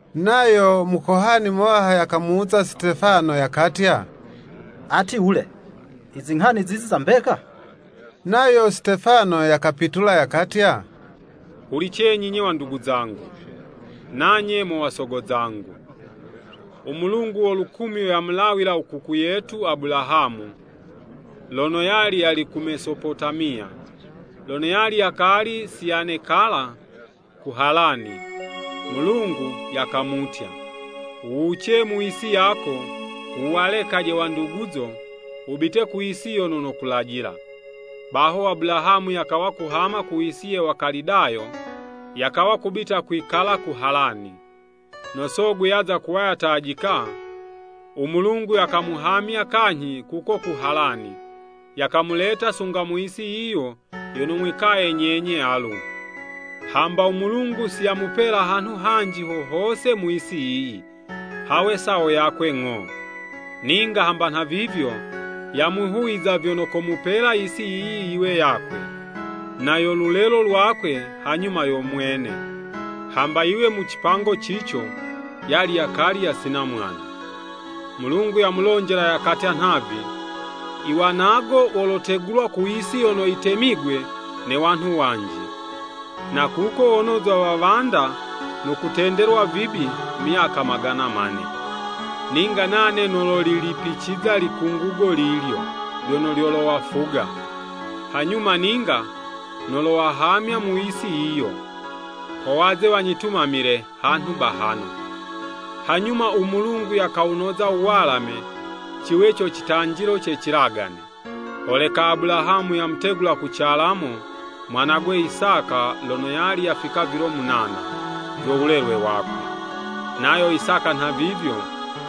Nayo Mukohani muwaha yakamuwuza Sitefano yakatya, “Ati wule, izinghani zizi za mbeka?” Nayo Sitefano yakapitula yakatya, “Hulicizenyi, 'nye wandugu zangu, nanye mo wasogo zangu, u Mulungu wo lukumyo yamulawila u kuku yetu Abulahamu, lono yali ku Mesopotamiya, lono yali yakali si yanekala ku Halani. Mulungu yakamutya, ‘Wuwuce mu yisi yako, wuwalekaje wanduguzo, wubite ku yisi yono nokulajila.’ Baho Abulahamu yakawa kuhama ku yisi ye Wakalidayo, yakawa kubita kwikala ku Halani. No sogwe yaza kuwa yatajika, u Mulungu yakamuhamya kanyhi kuko ku Halani, yakamuleta sunga mu yisi yiyi yono mwikaye nyenye alu. Hamba u Mulungu si yamupela hanhu hanji ho hose mu yisi yiyi, hawe sawo yakwe ng'o. Ninga hamba nhavivyo, yamwihuwiza vyono komupela yisi yiyi yiwe yakwe, na yo lulelo lwakwe hanyuma yo mwene, hamba yiwe mu cipango cico, yali yakali yasina mwana. Mulungu yamulonjela yakatya nhavi, ‘I wanago wolotegulwa ku yisi yono yitemigwe ne wanhu wanji, na kuko wonozwa wawanda no kutendelwa vibi myaka magana mane. Ninga nane nololilipiciza likungugo lilyo lyono lyolowafuga. Hanyuma ninga, nolowahamya mu yisi yiyo, ho waze wanyitumamile hanhu bahano.’ Hanyuma u Mulungu yakawunoza u walame, ciwe co citanjilo ce cilagane. Holeka Abulahamu yamutegula ku calamo mwanagwe Isaka lono yali yafika vilo munana vyo wulelwe wakwe. Nayo Isaka nhavivyo,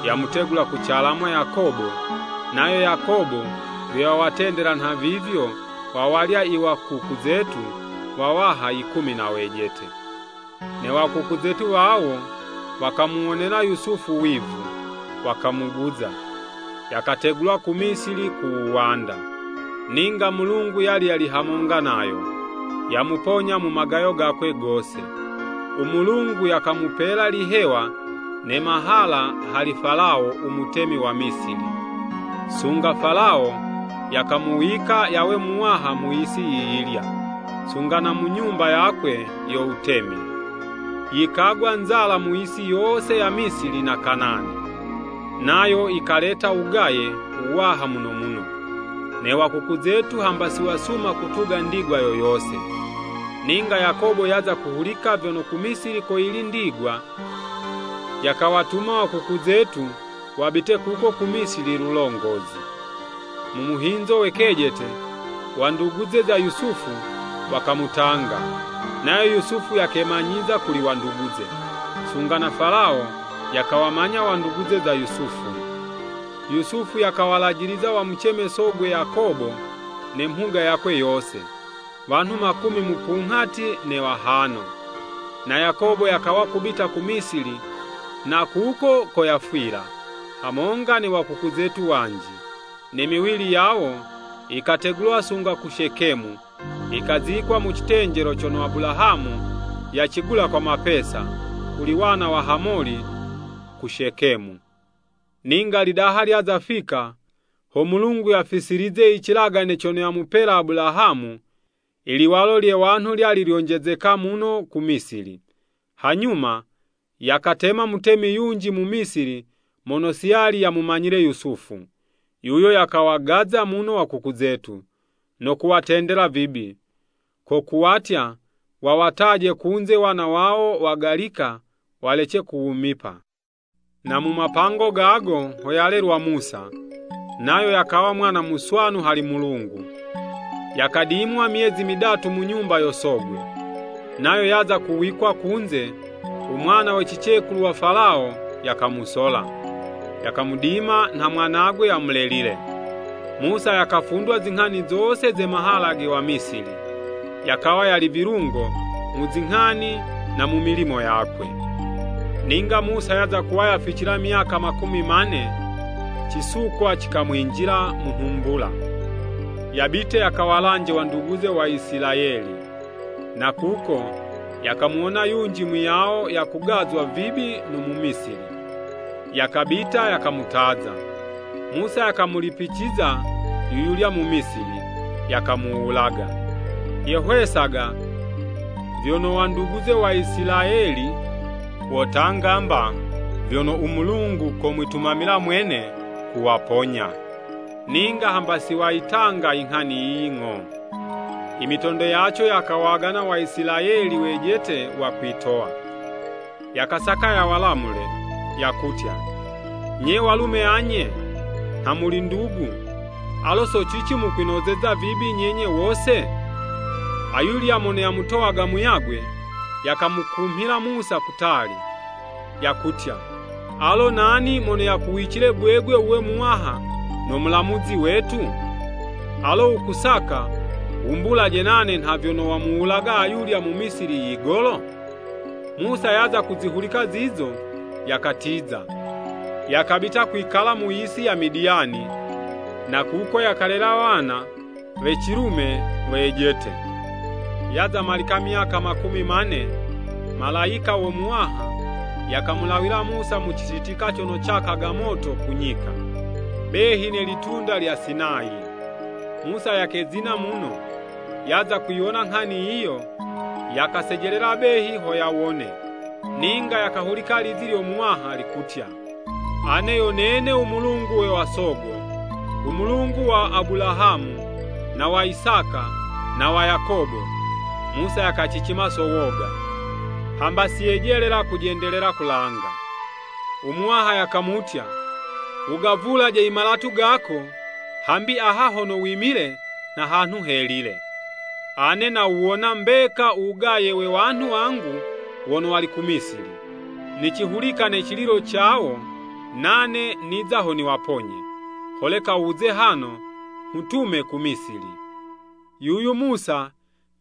yamutegula ku calamo Yakobo, nayo Yakobo vyo yawatendela nhavivyo wawalya iwakuku zetu wawaha yikumi na wejete. “Ne wa kuku zetu wawo, wakamuwonela Yusufu wivu, wakamuguza, yakategulwa ku Misili ku wuwanda. Ninga Mulungu yali yali hamonga nayo. Yamuponya mu magayo gakwe gose. U Mulungu yakamupela lihewa ne mahala hali Falawo u mutemi wa Misili, sunga Falawo yakamuwika yawe muwaha mu yisi yiyilya, sunga na mu nyumba yakwe yo wutemi. Yikagwa nzala mu yisi yose ya Misili na Kanani, nayo yikaleta wugaye wuwaha muno muno, ne wakuku zetu hamba si wasuma kutuga ndigwa yo yose. Ninga Yakobo yaza kuhulika vyono ku Misili koyili ndigwa, yakawatuma wakuku zetu wabite kuko ku Misili lulongozi. Mu muhinzo we kejete, wanduguze za Yusufu, wakamutanga, nayo Yusufu yakemanyiza kuli wanduguze, sunga na Falawo yakawamanya wanduguze za Yusufu. Yusufu yakawalajiliza wamuceme sogwe Yakobo ne mhuga yakwe yose, wanhu makumi mupunghati na wahano. Na Yakobo yakawa kubita ku Misili na kuko ko yafwila, hamonga ne wakuku zetu wanji. Ne miwili yawo, yikategulwa sunga ku Shekemu, yikazikwa mu citenjelo cono Abulahamu yacigula kwa mapesa, kuli wana wa Hamoli ku Shekemu. “Ninga lidaha lyaza fika, ho Mulungu yacifisilize icilagane cono yamupela Abulahamu, iliwalo lye wanhu lyali lyonjezeka muno ku Misili. Hanyuma, yakatema mutemi yunji mu Misili mono si yali yamumanyile Yusufu. Yuyo yakawagaza muno wakuku zetu, no kuwatendela vibi, ko kuwatya, wawataje kunze wana wawo wagalika walece kuwumipa. Na mu mapango gago, ho yalelelwa Musa, nayo yakawa mwana muswanu hali Mulungu, yakadimwa myezi midatu mu nyumba yo sogwe. Nayo yaza kuwikwa kunze, u mwana we cicekulu wa Falawo yakamusola, yakamudima nha mwanagwe yamulelile. Musa yakafundwa zinghani zose ze mahala ge Wamisili, yakawa yali vilungo mu zinghani na mu milimo yakwe. Ninga Musa yaza kuwa yaficila myaka makumi mane, cisukwa cikamwinjila mu nhumbula, yabite yakawalanje wanduguze Waisilayeli. Na kuko, yakamuwona yunji muyawo yakugazwa vibi no Mumisili, yakabita yakamutaza, Musa yakamulipiciza yuyulya Mumisili, yakamuwulaga. (Yehwesaga vyono wanduguze Waisilayeli, wotanga mba vyono u Mulungu komwitumamila mwene, kuwaponya, ninga hamba si wayitanga i nghani yiyi ng'o.) Imitondo yaco yakawagana Waisilayeli wejete wakwitowa, yakasaka yawalamule, yakutya, ‘Nye walume anye, nha muli ndugu, alo so cici mukwinozeza vibi nyenye wose?’ Ayulya mono yamutowaga muyagwe, yakamukumhila Musa kutali, yakutya, ‘Alo nani mono yakuwicile gwegwe wuwe muwaha, na mulamuzi wetu? Alo wukusaka wumbulaje nane nha vyono wamuwulaga ayulya Mumisili yigolo?’ Musa yaza kuzihulika zizo, yakatiza, yakabita kwikala mu yisi ya Midiyani, na kuko yakalela wana we cilume wejete. “Yaza malika myaka makumi mane, Malayika wo Muwaha yakamulawila Musa mu cititika cono cakaga moto ku nyika, behi ne litunda lya Sinayi. Musa yakezina muno, yaza kuyiwona nghani yiyo, yakasejelela behi ho yawone, ninga yakahulika lizi lyo Muwaha, likutya, ‘Ane yo nene u Mulungu we wasogo, u Mulungu wa Abulahamu, na wa Isaka, na wa Yakobo!’ Musa yakacicima so woga, hamba si yejelela kujendelela kulanga. U Muwaha yakamutya, ‘Wugavulaje imalatu gako, hambi aha hono wimile nha hanhu helile. Ane, nawuwona mbeka u wugaye we wanhu wangu wono wali ku Misili. Nicihulika ne cililo cawo, nane niza ho niwaponye. Holeka wuze hano, nghutume ku Misili.’ “Yuyu Musa,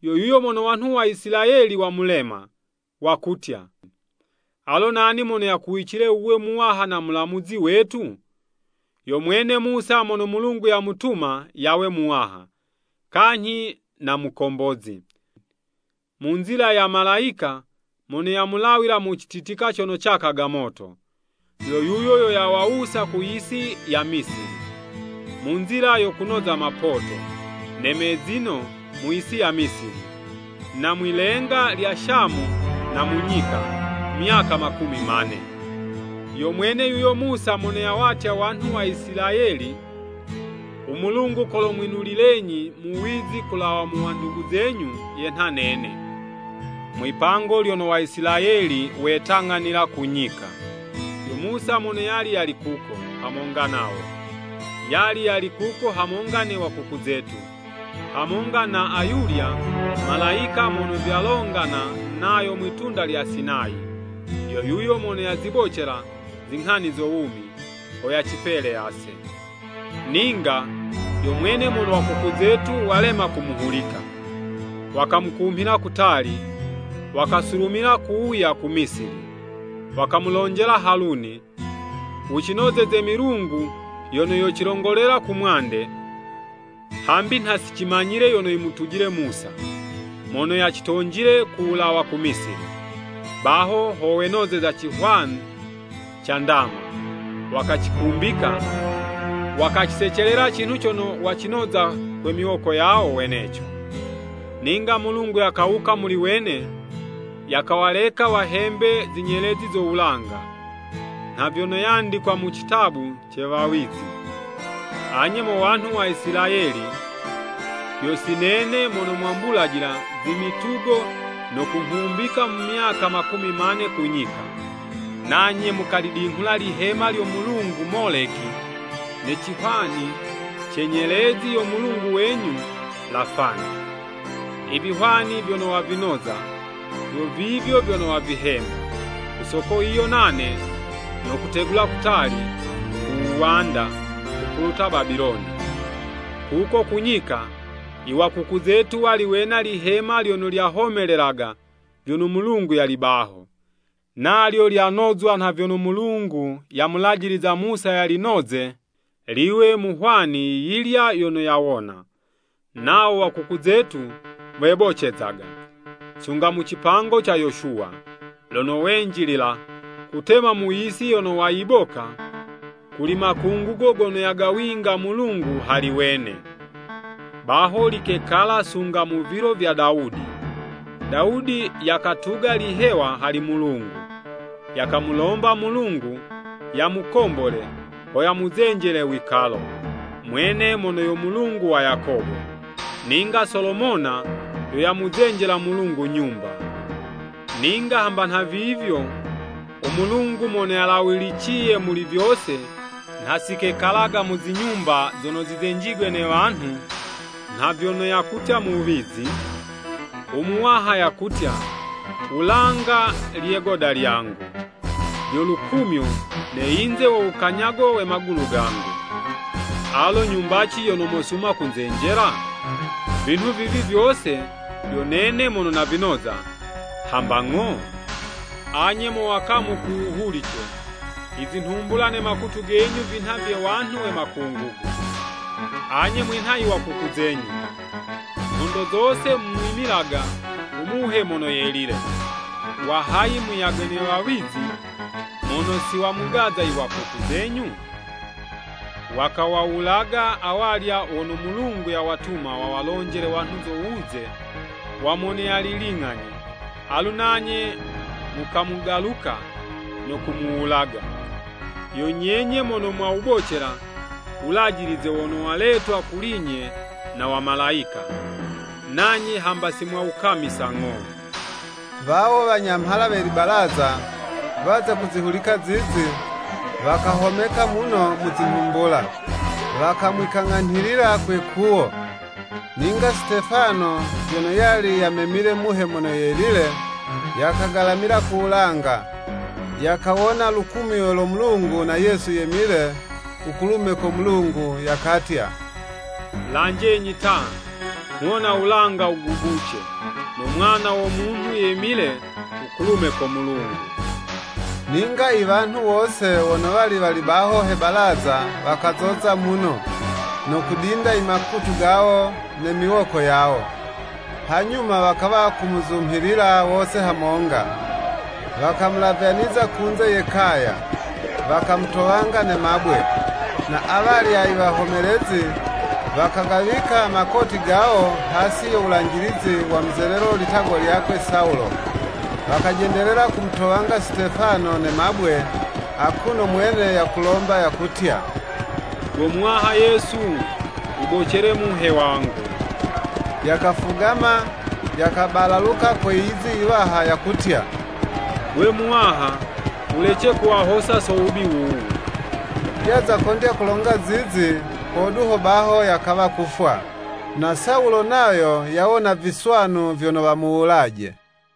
yo yuyo mono wanhu wa Isilayeli wamulema, wakutya, ‘Alo nani mono yakuwicile wuwe muwaha na mulamuzi wetu?’ Yo mwene Musa mono Mulungu yamutuma yawe muwaha, kanyhi na mukombozi, mu nzila ya Malayika mono yamulawila mu cititika cono cakaga moto. Yo yuyo yo yawawusa ku yisi ya Misili, mu nzila yo kunoza mapoto, na mezino mu yisi ya Misili, na mwi'lenga lya Shamu na mu nyika, myaka makumi mane. Yo mwene yuyo Musa mono yawatya wanhu wa Isilayeli, ‘U Mulungu kolomwinulilenyi Muwizi kulawa mu wandugu zenyu yenha nene.’ Mwi'pango lyono Waisilayeli wetang'anila ku nyika, yo Musa mono yali yali kuko, hamonga nawo. Yali yali kuko hamonga ne wakuku zetu, hamonga na ayulya malayika mono vyalongana nayo mwi'tunda lya Sinayi, yo yuyo mono yazibocela zinghani zo wumi, ho yacipele ase. “Ninga, yo mwene mono wakuku zetu walema kumuhulika, wakamukumhila kutali, wakasulumila kuwuya ku Misili. Wakamulonjela Haluni, ‘Wucinozeze milungu yono yocilongolela kumwande, hambi nha si cimanyile yono yimutujile Musa, mono yacitonjile ku wulawa ku Misili!’ Baho ho wenozeza cihwani ca ndama, wakacikumbika, wakacisecelela cinhu cono wacinoza kwe miwoko yawo weneco. Ninga Mulungu yakawuka muli wene, yakawaleka wahembe zi nyelezi zo wulanga, nha vyono yandikwa mu citabu ce wawizi, ‘Anye mo wanhu wa Isilayeli! Yo si nene mono mwambulajila zimitugo no kunghumbika mu myaka makumi mane ku nyika! Nanye mukalidinghula lihema lyo mulungu Moleki, ne cihwani ce nyelezi yo mulungu wenyu Lafani. Ivihwani vyono wavinoza, vyo vivyo vyono wavihemba. Ku soko yiyo nane, nokutegula kutali, ku wuwanda, kupuluta Babiloni.’ “Kuko ku nyika, i wakuku zetu wali wena lihema lyono lyahomelelaga vyono Mulungu yali baho. Nalyo lyanozwa nha vyono Mulungu yamulajiliza Musa yalinoze, liwe mu hwani yiyilya yono yawona. Nawo wakuku zetu webocezaga, sunga mu cipango ca Yoshuwa, lono wenjilila kutema mu yisi yono wayiboka kuli makungugo gono yagawinga Mulungu hali wene. Baho likekala sunga mu vilo vya Dawudi. Dawudi yakatuga lihewa hali Mulungu, yakamulomba Mulungu yamukombole, ho yamuzenjele wikalo, mwene mono yo Mulungu wa Yakobo. Ninga Solomona yo yamuzenjela Mulungu Nyumba. Ninga hamba nhavivyo u Mulungu Mono Yalawiliciye Muli vyose, nha si kekalaga mu zinyumba zono zizenjigwe ne wanhu, nha vyono yakutya muwizi, ‘U Muwaha yakutya, Wulanga lye 'goda lyangu, lyo lukumyo Ne yinze wo wukanyago we magulu gangu, Alo nyumbaci yono mosuma kunzenjela? Vinhu vivi vyose, yo nene mono navinoza, hamba ng'o?’ “Anye mo wakamu ku wuhulice! Izinhumbula ne makutu genyu vinha vye wanhu we makungugo. Anye mwinha i wakuku zenyu. Nhondo zose mumwimilaga u Muhe Mono Yelile. Wahayi muyagwe ne wawizi, mono si wamugaza iwakuku zenyu? Wakawawulaga awalya wono Mulungu yawatuma wawalonjele wanhu zo wuze wa Mono yali ling'ani, alu nanye mukamugaluka, no kumuwulaga. Yo nyenye mono mwawubocela Wulajilize wono waletwa kuli'nye na Wamalayika, nanye hamba si mwawukamisa ng'o.” Wawo wanyamhala we libalaza, waza kuzihulika zizi, wakahomeka muno muzi nhumbula, wakamwikang'anhilila kwe 'kuwo. Ninga Sitefano vyono yali yamemile Muhe Mono Yelile, yakagalamila ku wulanga, yakawona lukumyo lo Mulungu na Yesu yemile u kulume ko Mulungu. Yakatya, “Lanjenyi ta! Nghuwona wulanga wugubuce, no Mwana wo Munhu yemile u kulume ko Mulungu.” Ninga iwanhu wose wono wali wali baho he balaza wakazoza muno, no kudinda imakutu gawo ne miwoko yawo. Hanyuma wakawa kumuzumhilila wose hamonga, wakamulavyaniza kunze ye kaya, wakamutowanga ne mabwe. Na awalya i wahomelezi, wakagawika makoti gawo hasi yo wulanjilizi wa muzelelo litagwa lyakwe Sawulo. Wakajendelela kumutowanga Sitefano ne mabwe, akuno u mwene yakulomba yakutya, “Go Muwaha Yesu, wubocele Muhe wangu!” Yakafugama yakabalaluka kwe yizi yiwaha, yakutya, “Gwe Muwaha wulece kuwahosa so wubi wuwu.” Yaza kondya kulonga zizi, hodu ho baho yakawa kufwa. Na Sawulo nayo yawona viswanu vyono wamuwulaje.